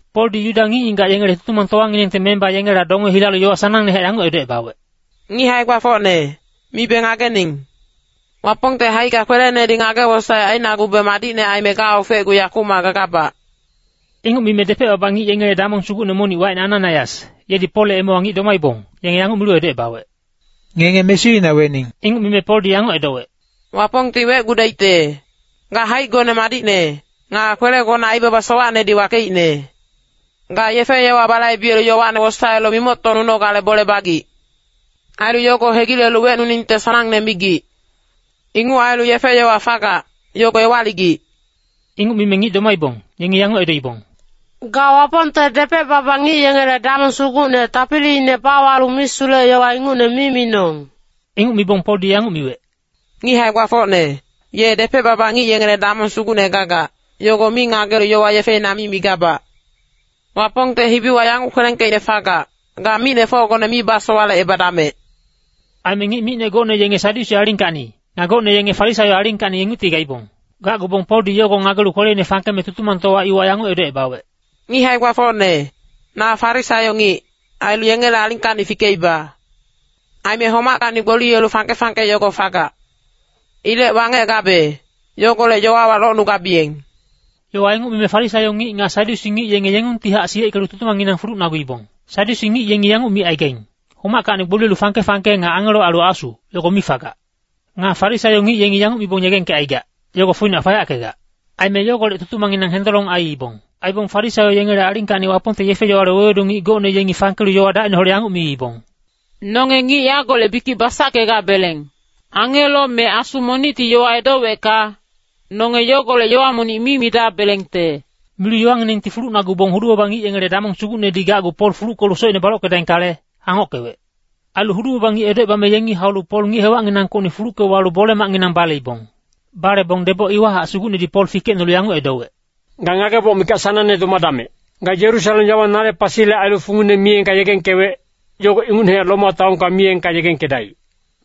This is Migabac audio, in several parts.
Poldi Yuda ngic-ngigac yengele Tutumangtowanginengte memba yengela donge hilalu yowa sanangnehac yanguc edocebawec, “Ngic hae-gbafocne, mibe ngagening. Wapongte haicka kwelenedi ngage-wosaec ainagube madicne aime gaofecgu yakumac gagabac.” Inguc mime depec-baba ngic yengele damong sugucne monic wacine Ananaias, yedi Polle emewa ngic domaibong, yenge yanguc milu edocebawec, “Ngenge mesuina wening.” Inguc mime Poldi yanguc edowec, “Wapongti wecgudaicte! Ga haicgone madicne, nga kwelegona aibaba sowacnedi wakeicne. Ga yefe-yowa balaibelu yowane wosaelu mimoctocnunogale bole bagic. Ailu yogo hegilelu wecnuningte sanangne migic. Inguc ailu yefe-yowa fagac, yogo ewaligic.” Inguc mime ngic domaibong, yengi yanguc edoibong, “Ga Wapongte depec-baba ngic yengele damong sugucne tapiliine bawalu misulec-yowa ingucne mi minong!” Inguc mibong Poldi yanguc miwec, “Ngic hae-gbafocne, ye depec-baba ngic yengele damong sugucne gagac, yogo mi ngagelu yowa yefeina mi migabac. Wapongte hibiwa yanguc kwelengkeicne fagac, ‘Ga micnefocgone mi misowalecebadamec.’” Aime ngic micne gocne yenge Sadyusi alingkacni, nga gocne yenge Farisaio alingkacni ingucti gaibong. Gacgubong Poldi yogo ngagelu kweleine fangkeme Tutumangtowa iwa yanguc edocebawec, “Ngic hae-gbafocne, na Farisaio ngic, ailu yengele alingkacni fikeiba. Aime homackacni gboliyelu fangke-fangke yogo fagac. Ilec wangec gabe, yogolec yowawa locnugabiyeng.” Yowa inguc mime Farisaio ngic nga Sadyusi ngic yenge yengungtihac siyeckelu tutumangnginang fulucnaguibong. Sadyusi ngic yengi yanguc micaigaing, “Homackacni gboliyelu fangke-fangke nga angelo ailu asu, yogo mi fagac.” Nga Farisaio ngic yengi yanguc mibong yegengkecaigac, “Yogo foinac fayackegac.” Aime yogolec tutumangnginang hendolong aiibong. Aibong Farisaio yengele alingkacni Wapongte yefe-yowale wewedu ngic gocne yengi fangkelu yowa dacineholec yanguc miibong, “Nonge ngic yagolec bikic basackegabeleng. Angelo me asu monicti yowa edowecka, nonge yogolec yowa monic mi midabelengte.” Milu yowanginengti fulucnagubong hudu-baba ngic yengele damong sugucnedi gacgu Pol fuluckelu socine balockedaingkale, hangockewec. Ailu hudu-baba ngic edocebame yengi haulu Pol ngic hewacnginangkocni fulucke walu bole-macnginang baleibong. Balebong deboc iwahac Sugucnedi Pol fikecnolu yanguc edowec, “Ga ngageboc mikac sanangne domadamec. Ga Yerusalem yawa nale pasile ailu fungine miyengka yegengkewec, yogo ingucnehac Roma taonka miyengka yegengkedaic.”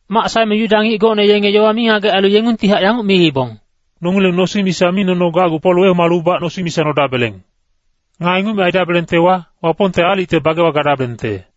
Mac saeme Yuda ngic gocne yenge yowa mingagec ailu yengungtihac yanguc miibong, “Nongileng nosing misa mi nono gacgu Pol wehomalubac nosing misa nodabeleng. Nga inguc mi aidabelengtewa, Wapongte aalicte bagewa gadabelengte.”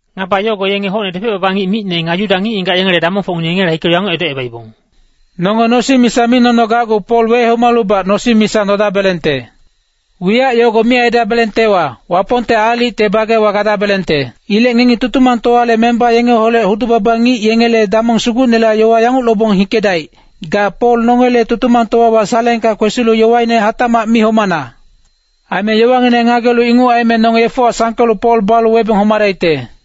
Ngaba yogo yenge hocne depec-baba ngic micne nga Yuda ngic-ngigac yengele damongfocngineng yengela hikelu yanguc edocebaibong, “Nonge nosing misa mi nono gacgu Pol wehomalubac nosing misa nodabelengte. Wiyac yogo mi aidabelengtewa, Wapongte aalicte bagewa gadabelengte. Ilec ngengi Tutumangtowale memba yengeholec hudu-baba ngic yengele damong sugucnela yowa yanguc lobong hikedaic, ‘Ga Pol nongele Tutumangtowawa saleengka kwesilu yowaine hatacmac mihomana.’ Aime yowangineng ngagelu inguc aime nonge yefewa sangkelu Pol balu webeng homadaicte.”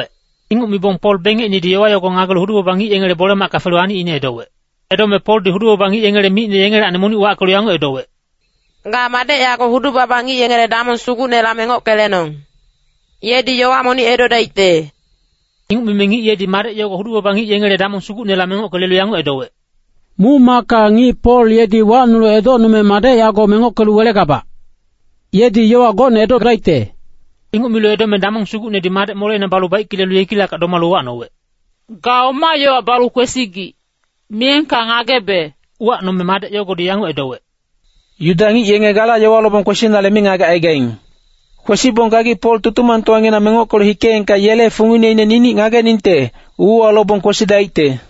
Inguc mibong Pol bengecinedi yowa yogo ngagelu hudu-baba ngic yengele bole-macka felu anicine edowec. Edome Poldi hudu-baba ngic yengele micne yengelacni monic wackelu yanguc edowec, “Ga madec yago hudu-baba ngic yengele damong sugucnela mengocke lenong. Yedi yowa monic edodaicte.” Inguc mime ngic yedi madec yogo hudu-baba ngic yengele damong sugucnela mengocke lelu yanguc edowec, “Muc-macka ngic Pol yedi wacnulu edocnume madec yago mengockelu welegabac. Yedi yowa gocne edocgudaicte.” Inguc milu edome damong sugucnedi madec moleina balu baicke lelu yekilackac domalu uwacnowec, “Ga oma yowa balu kwesigic, miyengka ngagebe.” Uwacnome madec yogodi yanguc edowec, “Yuda ngic yenge gala yowa lobong kwesinale mingagec aigaing. Kwesibong gagi Pol Tutumangtowanginang mengockelu hikeengka yele fungineine ninic ngageningte, uuwa lobong kwesidaicte.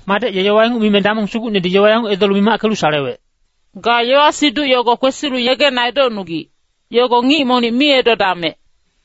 Madec ye yowa inguc mime damong sugucnedi yowa yanguc edolu mimackelu salewec, “Ga yowa-siduc yogo kwesilu yegena edocnugic, yogo ngic monic mi edodamec.”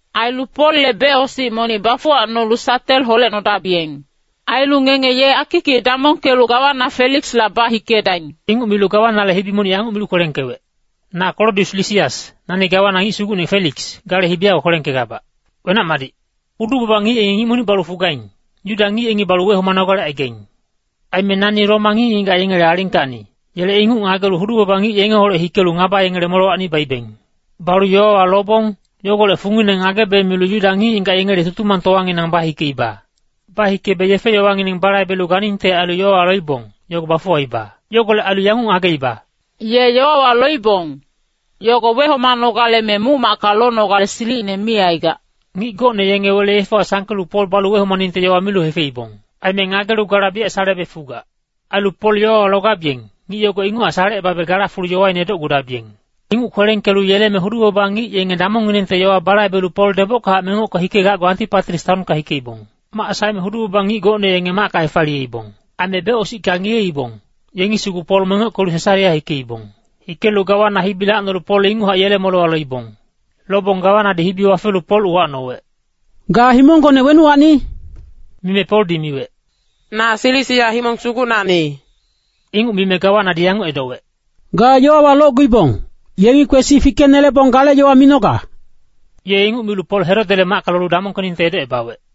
Ailu Polle becosic monic bafuwacnolu satel holecnodabiyeng. Ailu ngenge ye akikic damongkelu gawana Feliksla bahikedaing.” Inguc milu gawanale hibi monic yanguc milu kwelengkewec, Na Klodius Lisias, nani gawana ngic sugucne Feliks, gale hibi yago kwelengkegabac. Wenac-madic. Hudu-baba ngic yengi ngic monic balu fugaing, Yuda ngic yengi balu wehomanogale aigaing. Aime nani ye Roma ngic-ngigac yengele alingkacni, yele inguc ngagelu hudu-baba ngic yengeholec hikelu ngaba yengele molewacni baibeng. Balu yowawa lobong, yogolec fungine ngagebe milu Yuda ngic-ngigac yengele Tutumangtowanginang bahikeiba. Bahikebe yefe-yowangineng balaibelu ganingte ailu yowawa loibong, yogo bafuwaiba. Yogolec ailu yanguc ngageiba, “Ye yowawa loibong, yogo wehomanogale me muc-macka lonogale silicine mi aigac.” Ngic gocne yenge wele yefewa sangkelu Pol balu wehomaningte yowa milu hefeibong. Aime ngagelu gala biyac salebe fugac. Ailu Pol yowawa logabiyeng, ngic yogo inguchac salecebabe gala fulu yowaine edocgudabiyeng. Inguc kwelengkelu yeleme hudu-baba ngic yenge damongnginengte yowa balaibelu Pol debockahac mengocke hikegacgu Antipatris taonka hikeibong. Mac saeme hudu-baba ngic gocne yenge macka hefaliyeibong. Aime becosicka ngiyeibong, yengi sugu Pol mengockelu Sesarea hikeibong. Hikelu gawana hibi lacnolu Pol inguchac yele molewa loibong. Lobong gawanadi hibi wafelu Pol uwacnowec, “Ga himonggone wenuwacni?” Mime Poldi miwec, “Na Silisia himong sugucnacni.” Inguc mime gawanadi yanguc edowec, “Ga yowawa locguibong, yengi kwesi fikenelebong gale yowa minoga.” Ye inguc milu Pol Herodele macka lolu damongkeningte edocebawec.